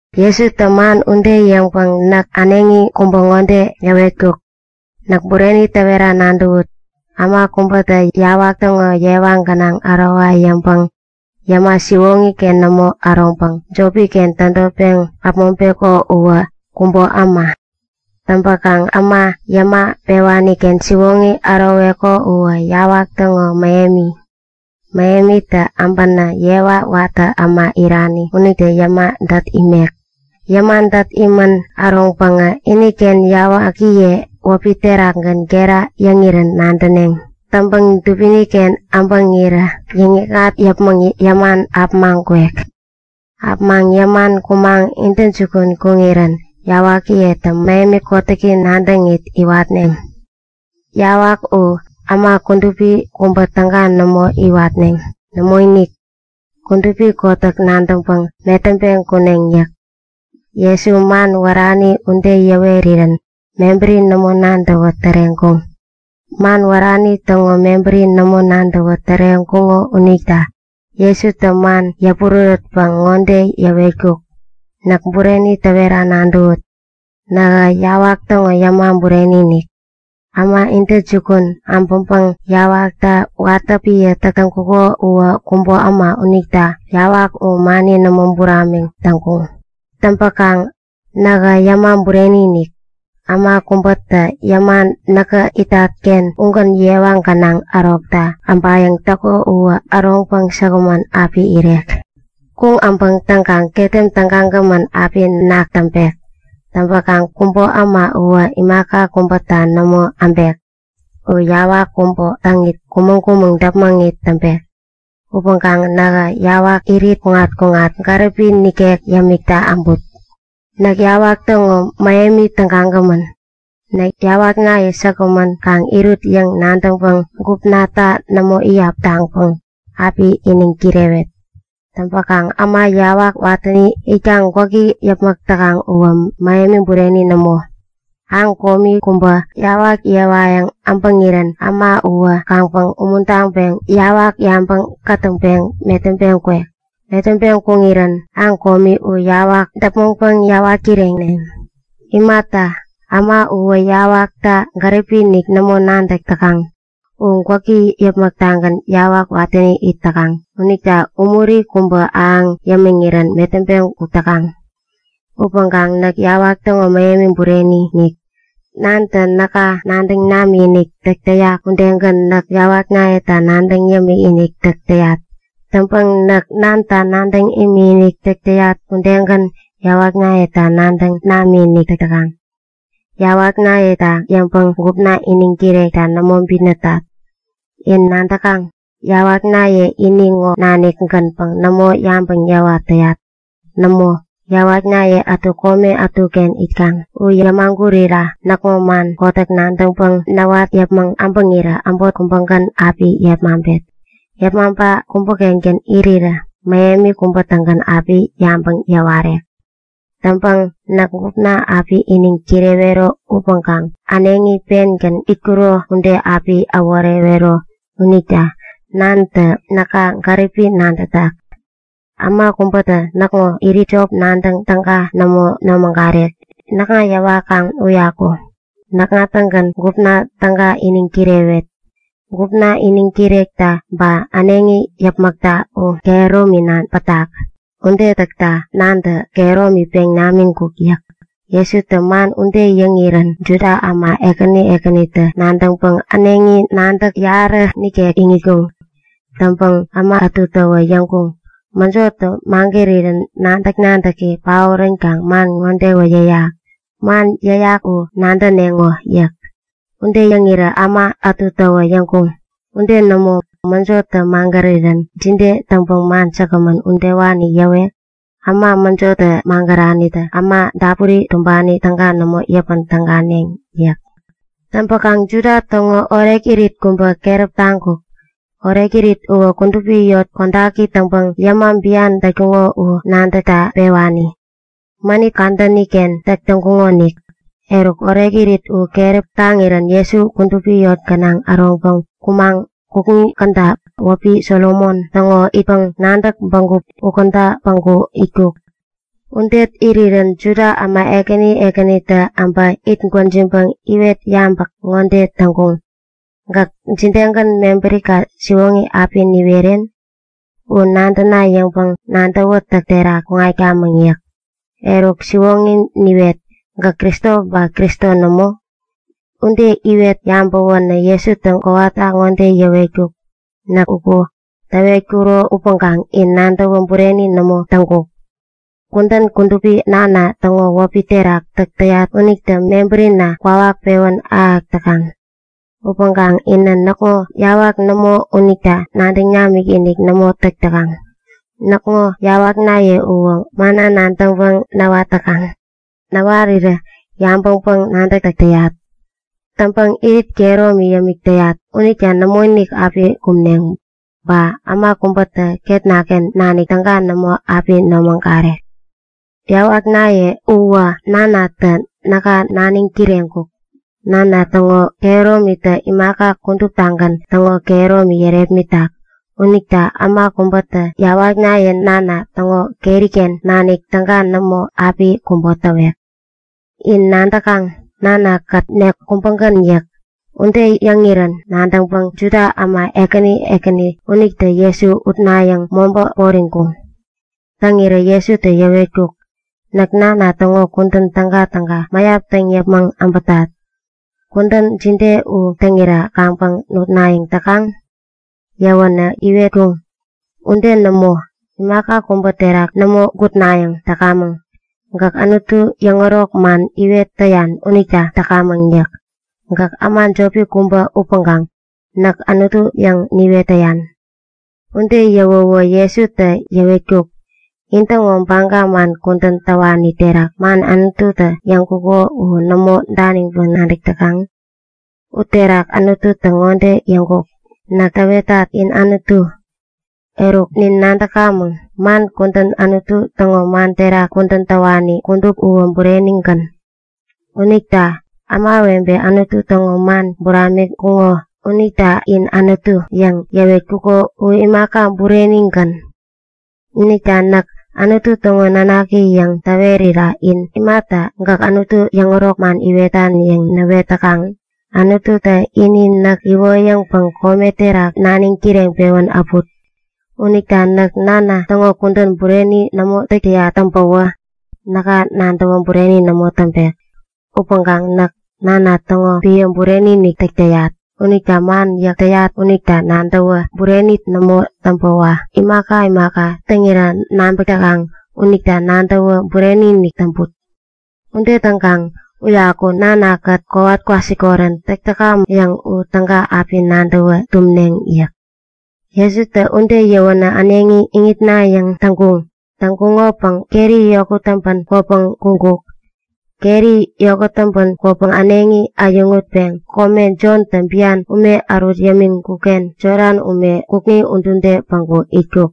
Jesutä man ude yäŋpäŋ äneŋi kubä ŋode yäwetkuk; Näk bureni täwera nadäwut; Äma kubätä yawak täŋo yewa gänaŋ ärowa yäŋpäŋ yäma siwoŋi-ken nämo äroŋpäŋ jopi-ken tädotpeŋ äpmoŋpeko uwä kubo äma. Täŋ äma yäma pewani-ken siwoŋi äroweko uwä yawak täŋo mähemi. Mähemitä äbänä yewa watä äma irani unitä yäma dät imek. Yäma dät imän äroŋpäŋä iniken yawakiye wäpi terakgän gera yäŋirän nadäneŋ. Täŋpäŋ dubini-ken äbäŋirä yäŋ-yäkŋat yäpmäŋ yäman äpämaŋ kwek. Äpämaŋ yäman kumaŋ intäjukun kuŋirän yawakiyetä mähemi kotäki nadäŋit iwatneŋ. Yawak u äma kudupi kubä täga nämo iwatneŋ. Nämoinik, kudupi kotäk nadäŋpäŋ metäŋpeŋ kuneŋ yäk. Jesutä man wärani ude yäwerirän mebäri nämo nadäwä täreŋkuŋ. Man wärani täŋo mebäri nämo nadäwä täreŋkuŋo unita Jesutä man yäpurärätpäŋ ŋode yäwetkuk; Näk bureni täwera nadäwut. Nähä yawak täŋo yäma bureni-inik. Äma intäjukun äbäŋpäŋ yawakta watä epän täk täŋkuŋo uwä kubo äma unita yawak u mani nämo buramik täŋkuŋ. Täŋpäkaŋ nähä yäma bureni-inik. Äma kubätä yäma näkä itat-ken ugän yewa gänaŋ ärokta äbayäŋ täko uwä äroŋpäŋ säkgämän api irek. Kuŋ äbäk täŋkaŋ ketem tägagämän api nak täŋpek. Täŋpäkaŋ kubo äma uwä imaka kubäta nämo äbek. U yawak kubo täŋit kumäŋ-kumäŋ däpmäŋit täŋpek. Upäŋkaŋ nähä yawak irit kuŋat-kuŋat gäripi nikek yämikta äbut. Näk yawak täŋo mähemi tägagämän. Näk yawaknaye säkgämän kaŋ irut yäŋ nadäŋpäŋ gupnata nämo iyap taŋpäŋ api iniŋ kirewet. Täŋpäkaŋ äma yawak watäni itkaŋ gwäki yäpmäk täkaŋ uwä mähemi bureni nämo. Aŋ komi kubä yawak yewayäŋ äbäŋirän äma uwä kaŋpäŋ umuntaŋpeŋ yawak yabä kätäŋpäŋ metäŋpeŋ kwek. Metäŋpeŋ kuŋirän aŋ komi u yawak däpmäŋpäŋ yäwat kireneŋ. Imata, äma uwä yawakta gäripi-inik nämo nadäk täkaŋ. U gwäki yäpmäk-tagän yawak watäni it täkaŋ unita umuri kubä ahäŋ yämiŋirän metäŋpeŋ kuk täkaŋ. Upäŋkaŋ näk yawak täŋo mähemi bureni-inik. Nantä näka nadäŋ namikinik täk täyak udegän näk yawaknayeta nadäŋ yämikinik täk täyat. Täŋpäŋ näk Nanta nadäŋ imikinik täk täyat udegän yawaknayetä nadäŋ namikinik täk täkaŋ. Yawaknayeta yäŋpäŋ gupna iniŋ kirekta nämo bitnätat. In nadäkaŋ? Yawaknaye ini ŋo nanik-gänpäŋ nämo yabäŋ yäwat täyat. Nämo, yawaknaye ätu kome ätuken itkaŋ. U yämagurira näkŋo man kotäk nadäŋpäŋ näwat yäpmäŋ äbäŋirä äbot kubägän api yepmaŋpet. Yepmaŋpa kubä-kengän irirä mähemi kubä-tägän api yabäŋ yäwarek. Täŋpäkaŋ näk gupna api iniŋ kirewero upäŋkaŋ äneŋi pengän itkuro ude api äworewero unita Nantä näka gäripi nadätak. Äma kubätä näkŋo irit jop nadäŋ täga nämo nomägarek, näkŋa yäwakaŋ uyaku. Näkŋa-tägän gupna täga iniŋ kirewet. Gupna iniŋ kirekta ba äneŋi yäpmäkta u kehäromina pätak. Ude täkta Nantä kehäromi peŋ namiŋkuk yäk. Jesutä man ude yäŋirän Juda äma ekäni ekänitä nadäŋpäŋ äneŋi nadäk yarä nikek iŋitkuŋ. Täŋpäŋ äma ätutäwä yäŋkuŋ; Mäjotä magärirän nadäk-nadäki paoränkaŋ man ŋodewä yäyak! Man yäyak u nadäneŋo! yäk. Ude yäŋirä äma ätutäwä yäŋkuŋ; Ude nämo! Mäjotä magärirän jide täŋpäŋ man säkgämän udewani yäwek? Äma mäjotä magäranitä äma dapuri tumbani täga nämo yäpän täganeŋ yäk. Täŋpäkaŋ Juda täŋo orekirit kubä keräp taŋkuk. Orekirit uwä kudupi eŋi kodaki täŋpäŋ yäma bian dätkuŋo u nadäkta pewani. Mänit kadäni-ken täk täŋkuŋonik. Eruk orekirit u keräp taŋirän Jesu kudupi eŋi gänaŋ äroŋpäŋ kumaŋ kukŋi käda wäpi Solomon täŋo Itpäŋ-nadäk Bägup ukäda päŋku itkuk. Uken irirän Juda äma ekäni ekänitä äbä itgwäjiŋpäŋ iwet yabäk ŋode täŋkuŋ; Gäk jidegän mebärika siwoŋi api niweren? U nadäna yäŋpäŋ nadäwätäk terak kuŋatkamäŋ yäk. Eruk siwoŋi niwet; Gäk Kristo ba Kristo nämo? Ude iwet yabäwäwä Jesutä kowata ŋode yäwetkuk; Näk uku täwetkuro upäŋkaŋ in nadäwä bureni nämo täŋkuŋ. Kudän kudupi Nana täŋo wäpi terak täk täyat unitä mebärina kwawak pewän ahäk täkaŋ. Upäŋkaŋ inä näkŋo yawak nämo unita nadäŋ namikinik nämo täk täkaŋ. Näkŋo yawaknaye uwä manna nadäŋpäŋ näwat täkaŋ. Näwarirä yabäŋpäŋ-nadäk täk täyat. Täŋpäŋ irit kehäromi yämik täyat unita nämoinik api kumneŋ. Ba äma kubätä ketna-ken nanik täga nämo api nomägarek. Yawaknaye uwä Nanatä näka naniŋ kireŋkuk. Nana täŋo kehäromitä imaka kuduptagän täŋo kehäromi yärepmitak unita äma kubätä yawaknaye Nana täŋo keri-ken nanik täga nämo api kubo täwek. In nadäkaŋ? Nana-kät nek kubägän yäk. Ude yäŋirän nadäŋpäŋ Juda äma ekäni ekäni unitä Jesu utnayäŋ mobä poriŋkuŋ. Täŋirä Jesutä yäwetkuk; Näk Nana täŋo kudän tägatäga mäyap täŋ yäpmäŋ äbätat. Kudän jide u täŋira kaŋpäŋ nutnayäŋ täkaŋ? Yäwänä iwetkuŋ; Ude nämo. Imaka kubä terak nämo gutnayäŋ täkamäŋ. Gäk Anutu yäŋärok man iwet täyan unita täkamäŋ yäk. Gäk äma jopi kubä upäŋkaŋ Näk Anutu yäŋ niwet täyan! Ude yäwäwä Jesutä yäwetkuk; In-täŋo baga man kudän täwani terak man Anututä yäŋkuko u nämo daniŋpäŋ nadäk täkaŋ? Uterak Anututä ŋode yäŋkuk; Näk täwetat, in anutu. Eruk, nin nadäkamäŋ, man kudän Anutu täŋo man terak kudän täwani kudup uwä burenigän. Täŋ, ämawebe Anutu täŋo man buramiŋkuŋo unita “In anutu” yäŋ yäwetkuko u imaka, burenigän. Unita näk Anutu täŋo nanaki yäŋ täwerira in imata gäk Anutu yäŋärok man iwetan yäŋ näwet täkaŋ? Anututä ini näk iwoyäŋpäŋ kome terak naniŋ kireŋpewän äput. Unita näk Nana täŋo kudän bureni nämo täk täyat täŋpäwä näka nadäwä bureni nämo täŋpek. Upäŋkaŋ näk Nana täŋo epän bureni-inik täk täyat. Unita man yäk täyat unita nadäwä bureni nämo täŋpäwä imaka imaka täŋira nabäk täkaŋ unita nadäwä bureni-inik täŋput. Ude täŋkaŋ uyaku näk Nana-kät kowat kwasikorän täk täkamäk yäŋ u täga api nadäwä tumneŋ yäk. Jesutä ude yäwänä äneŋi iŋitnayäŋ täŋkuŋ. Täŋkuŋopäŋ keri yokut täŋpän kwäpeŋ kuŋkuk. Keri yokut täŋpän kwäpäŋ äneŋi äyäŋutpeŋ kome Jontä bian ume ärut yämiŋkuk-ken Jodan ume kukŋi udude päŋku itkuk.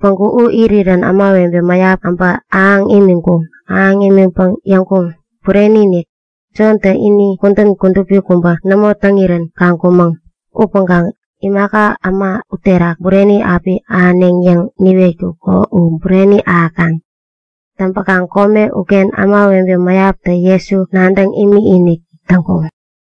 Päŋku u irirän ämawebe mäyap äbä ahäŋ imiŋkuŋ. Ahäŋ imiŋpäŋ yäŋkuŋ; Bureni-inik, Jontä ini kudän kudupi kubä nämo täŋirän kaŋkumäŋ. Upäŋkaŋ imaka äma uterak bureni api ahäneŋ yäŋ niwetkuko u bureni ahäkaŋ! Täŋpäkaŋ kome uken ämawebe mäyaptä Jesu nadäŋ imikinik täŋkuŋ.